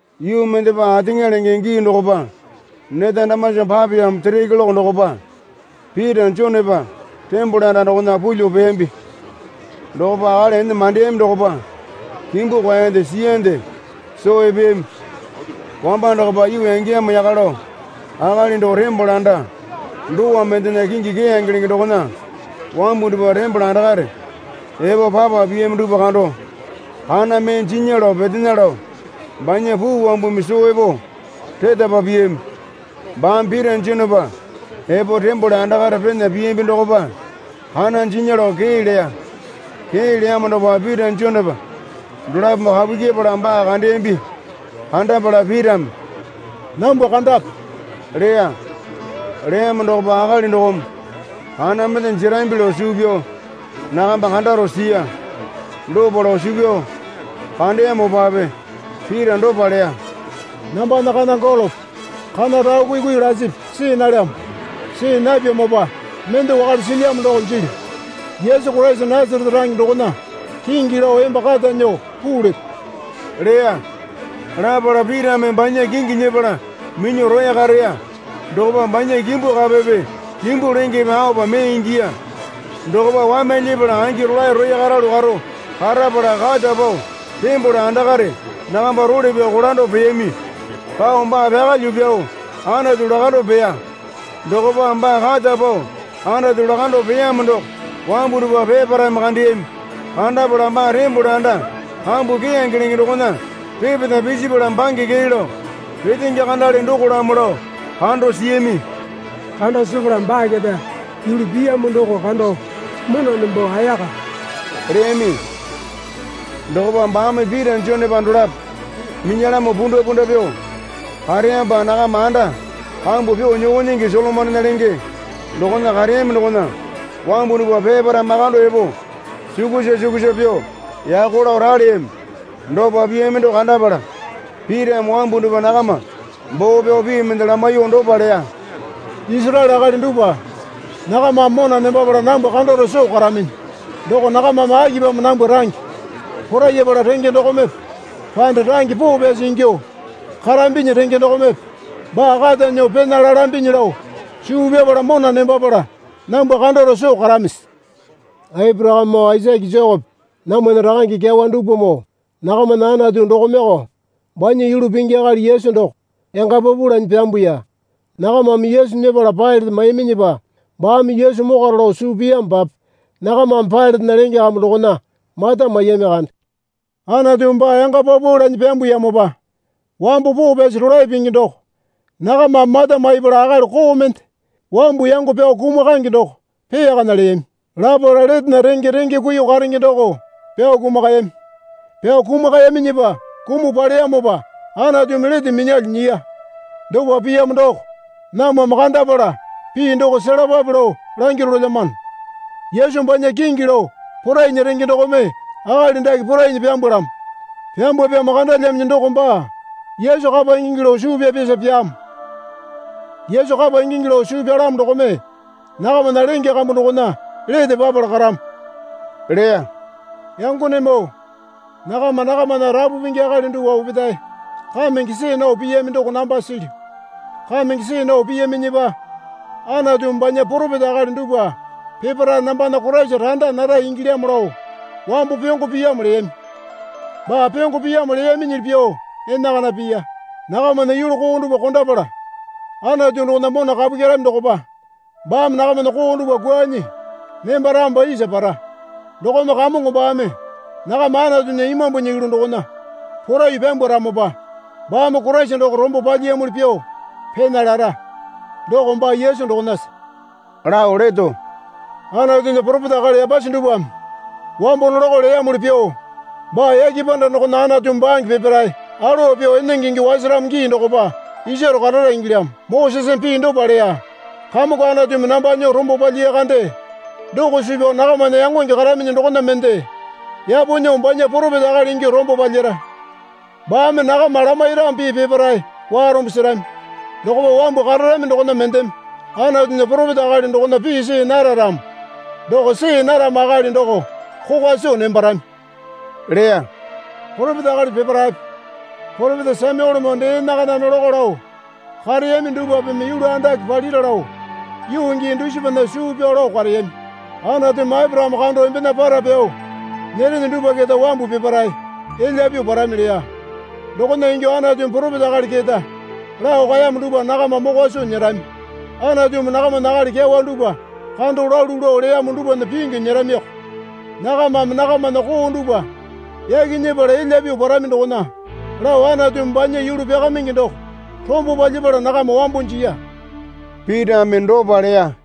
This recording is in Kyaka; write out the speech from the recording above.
Yuu mendepa ateŋa lenge gii dokopa neta damasa papeyamo sere keloke dokopa Pita Jonepa tembole anda dokona pulyuo peyambi. Dokopa akali ene mandeyami dokopa kimbu kwaeyande siyande soo epeyami. Wamba dokopa yuu yangeyamo yaka lao akali doko tembole anda dowa mendena kingi Keyange lenge dokona wambu dupwa tembole andakare epo papa piyami dupwa kando kana mee jinya lao petena lao banya puu wambumi soo epo retapa piyami. Baame Pita Jonepa epo tembole andakare pena piyambi dokopa kana jinya lao kee leya. Kee leyamo dokopa Pita Jonepa dolapome kapu kyepala baa kandeyambi. Kandapala Pitame, Nambwa kandape, leya. Leyamo dokopa akali dokome kana mende jerambi lao suu pyao nakamba kandaro siya. Dopa lao suu pyao kandeyamopape Pita dopa leya. Nambana kana golope kana rao kuikui lasipi see nalyamo. See napyamopa mende wakale silyamo doko jilyu. Yesu Koraisa Nasarete range dokona kingi lao emba kata nyuo puu leto, leya. Lapala Pitame banya kingi nyepala minyuo roya kareya. Dokopa banya kimbu kapepe kimbu lengepe aopa mee ingiya. Dokopa wamyalyepala angi rolae roya karalu karo karapala kata pao tembole andakare nakamba role pyao kolando peyami. Pao baa pyakalyuo pyao Anatu lakando peya. Dokopa baa kata pao Anatu lakando peyamo doko wambu dupwa peparaeme kandeyami. Kandapala baa tembole anda kambu Keyange lenge dokona repeta pisipala bange kee lao petenge kandale dokolamo lao kando siyami. Kando sepala baa keta yulu piyamo doko kando mona nembo ayaka leyami. Dokopa baame Pita Jonepa dolapo minyalamo pundapunda pyuo kareyamopa nakama anda kambu pyuo nyoko nyingi Solomonena lenge dokona kareyami dokona wambu dupwa peparae makando epo sukusa sukusa pyuo yako lao raleyami. Dopa piyami doko kandapala Pitame wambu dupwa nakama boo pyao pii mende lamaiyuo dopa leya. Isaraele akali dupwa, nakamame mona nembapala nambwa kandaro soo karaminyi doko nakamame akipamo nambwa range porayapala renge dokomepe panda range poo pyasi ingyuo karambinyi renge dokomepe baa kata nyuo pena lalambinyi lao suu pyapala mona nembapala nambwa kandaro soo karamisi? Aporakamemoo Aisake Jekope namwana rakange kyawa dupwamoo nakamana Anatu dokomeko banya Yulu Pingi akali Yesu doko yanga paupau lanyi pyambuya. Nakamame Yesu nyepala Pailate maiyaminyipa baame Yesu mokwaro lao suu piyamopape nakamame Pailatena lenge kambu dokona mata maiyami kande. Anatumi baa yanga paupau lanyi pyambuyamopa wambo poo pyasi rolae pingi doko nakamame mata maipala akali koo mende wambu yango pyao kumakange doko peyakana leyami. Lapala letena renge renge kuiyuo karenge doko pyao kumakayami. Pyao kumakayaminyipa kumuo paleyamopa Anatumi lete minyalyuo nyiya. Dopa piyamo doko namwame kandapala pii doko selapape lao langyuo rolelyamano. Yesu banya kingi lao porainya renge dokome akali dake porainyi pyambalamo. Pyambwapyamo kandalyaminyi doko baa Yesu kapa ingingi lao suu pyapyasa pyaamo. Yesu kapa ingingi lao suu pyalamo dokome nakamana lenge kambu dokona lete papala karamo leya. Yangonemoo, nakama nakamana rapu pingi akali dupwa opetae kamenge see nao piyami doko namba silyu. Kamenge see nao piyaminyipa Anatumi banya poropeta akali dupwa peparae nambana Koraisa randa nara ingilyamo lao wambo pyongo piyamo leyami. Baa pyongo piyamo leyaminyili pyuo enakana piya. Nakamana yulu koo dupwa kondapala Anatu dokona mona kapu kyerami dokopa baame nakamana koo dupwa kwuanyi nembaramopa isa para. Dokome Kamongo baame nakama Anatunya Imambunya yulu dokona poraiyuo pyambwaramopa baame Koraisa doko rombo palyiyamuli pyuo pena lara. Doko baa Yesu dokonasa lao leto. Anatunya poropeta akali yapasi dupwame wambo nolako leyamuli pyuo baa yake panda dokona Anatumi bange peparae alowa pyuo enenge ingyuo wasaramo gii dokopa isaro karara ingilyamo. Moseseme pii dopa leya. Kamongo Anatumi namba nyuo rombo palyiya kande doko suu pyao nakamana yangonge karaminyi dokona mende yapo nyuo banya poropeta akali ingyuo rombo palyara. Baame nakama lamairamo pii peparae warombo serami. Dokopa wambu kararami dokona mendeme Anatunya poropeta akali dokona pii see nara ramo doko see naramo akali doko kokwa soo nembarami leya. Poropeta akali peparaepe poropeta Samyuelemoo dee enakana nolako lao kareyami dupwapeme yulu andake palira lao yuu gii dusipana suu pyao lao kareyami. Anatumi Aporakame kando embena para pyao nyerene dupwa keta wambu peparae elya pyuo parami leya. Dokona ingyuo Anatumi poropeta akali keta lao kaeyamo dupwa nakama mokwa soo nyerami. Anatumi nakamana akali kyawa dupwa kando lalu lao leyamo dupwana pingyu nyeramioko. Nakamame nakamana koo dupwa yaki nyepala elya pyuo parami dokona lao Anatumi banya Yulu Pyakamaingi Doko rombo palyapala nakama wambo jiya. Pitame dopa leya.